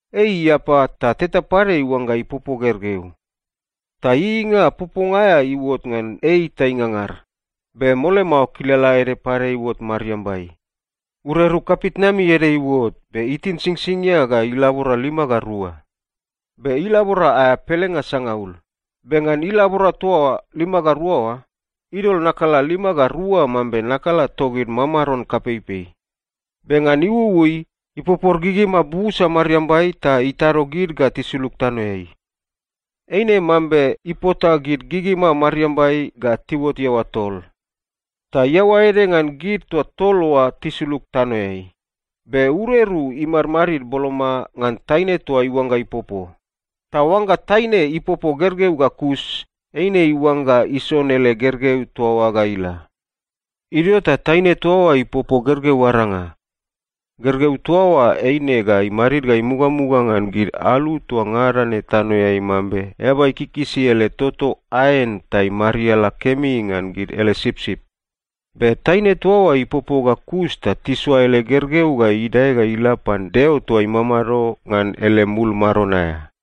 Ei iapa ta teta pade iuangga ipopo gergeu. Ta ieieinga poponga aea iuot ngan ei ta ingangar. Be mole mao kilala ede pade iuot mariambai. Ureru kapitnami ede iuot, be itin singsingia ga ilabora lima ga rua. Be ilabora aea pelenga sangaul. Be ngan ilabora toa lima ga rua oa, idol nakala lima ga rua mambe nakala togid mamaron kapeipei. Be ngan iuui, ipopor gigima busa mariambai ta itado gid ga tisulug tanoeai. Eine mambe ipota gid gigima mariambai ga tiuot iaoa tol. Ta iaoa ede ngan gid toa tol oa tisulug tanoeai. Be ureru imadmadid boloma ngan taine toa iuangga ipopo. Ta oangga taine ipopo gergeu ga kus, eine iuangga ison ele gergeu toa oa ga ila. Idio ta taine toa oa ipopo gergeu aranga. Gergeu toa oa eine ga imadid ga imugamuga ngan gid alu toa ngada ne tanoeai mambe eaba ikikisi ele toto aen ta imariala kemi ngan gid ele sipsip. Be taine toa oa ipopo ga kus ta tisoa ele gergeu ga idae ga ila pan Deo toa imamado ngan ele mul maron aea.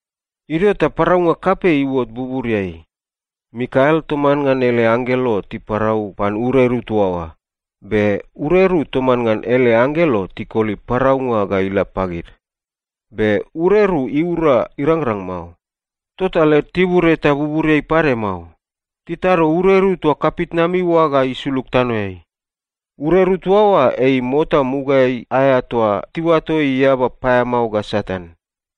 Idio ta paraunga kapei iuot buburiai. Mikael toman ngan ele anggelo tiparau pan ureru toa oa, be ureru toman ngan ele anggelo tikoli paraunga ga ila pagid. Be ureru iura irangrang mao. Tota led tibur eta buburiai pade mao. Titado ureru toa kapitnami oa ga isulug tanoeai. Ureru toa oa ei mota mugaeai aea toa tiuato ei eaba paeamao ga Satan.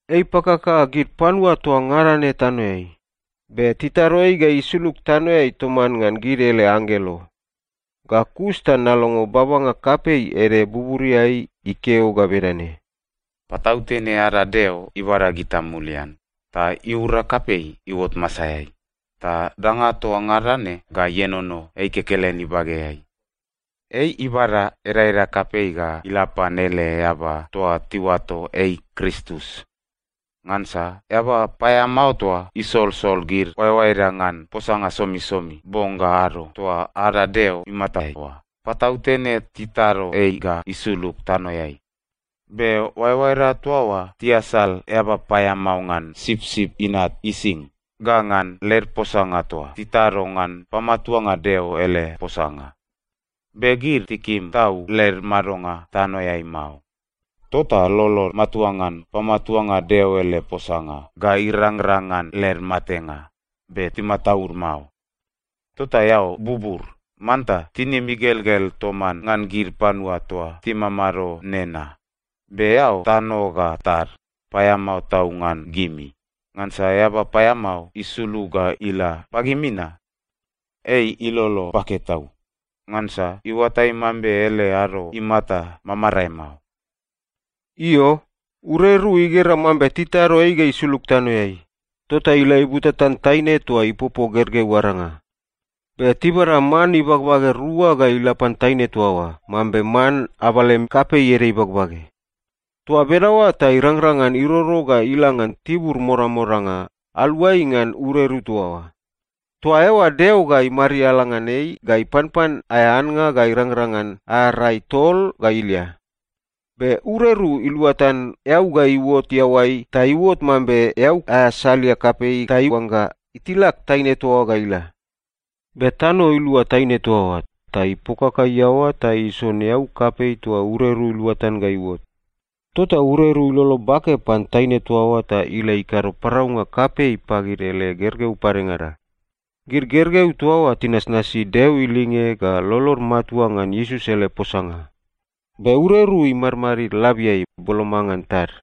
Ei ipakaka gid panua toa ngada ne tanoeai. Be titado ei ga isulug tanoeai toman ngan gid ele anggelo. Ga kus ta nalongo babanga kapei ede buburiai ikeo ga bedane, “Patautene ada Deo ibada gita mulian, ta iura kapei iuot masaeai. Ta danga toa ngada ne ga ienono ei kekelen ibageai. Ei ibada edaeda kapei ga ila pan ele eaba toa tiuato ei Kristus. Ngansa eaba paeamao toa isolsol gid oaeoaeda ngan posanga somisomi bong ga ado toa ada Deo imatai oa, patautene titado ei ga isulug tanoeai. Be oaeoaeda toa oa tiasal eaba paeamao ngan Sipsip Inat ising ga ngan led posanga toa tikado ngan pamatuanga Deo ele posanga. Be gid tikim tau led madonga tanoeai mao. Tota lolod matua ngan pamatuanga Deo ele posanga ga irangrang ngan led matenga, be timataud mao. Tota eao bubur, manta tinim igelgel toman ngan gid panua toa timamado nena! Be eao tano ga tad, paeamao tau ngan gimi! Ngansa eaba paeamao isulug ga ila pagimi na. Ei ilolo bake tau, ngansa iuatai mambe ele ado imata mamarae mao.” Io, ureru igera mambe titado ei ga isulug tanoeai. Tota ila ibutatan taine toa ipopo gergeu aranga. Be tibada man ibagbage rua ga ila pan taine toa oa, mambe man abalem kapei ede ibagbage. Toa bedaoa ta irangrang ngan iroro ga ila ngan tibur modamodanga, aluai ngan ureru toa oa. Toa eoa Deo ga imariala ngan ei ga ipanpan aea annga ga irangrang ngan aea rai tol ga ilia. Be ureru iluatan eau ga iuot iaoai ta iuot mambe eau aea salia kapei ta iuangga itilak taine toa oa ga ila. Be tano ilua taine toa oa, ta ipokaka iaoa ta ison eau kapei toa ureru iluatan ga iuot. Tota ureru ilolo bake pan taine toa oa ta ila ikado paraunga kapei pagid ele gergeu padengada. Gid gergeu toa oa tinasnasi Deo ilinge ga lolod matua ngan Iesus ele posanga. Be ureru imadmadid labiai, boloma ngan tad.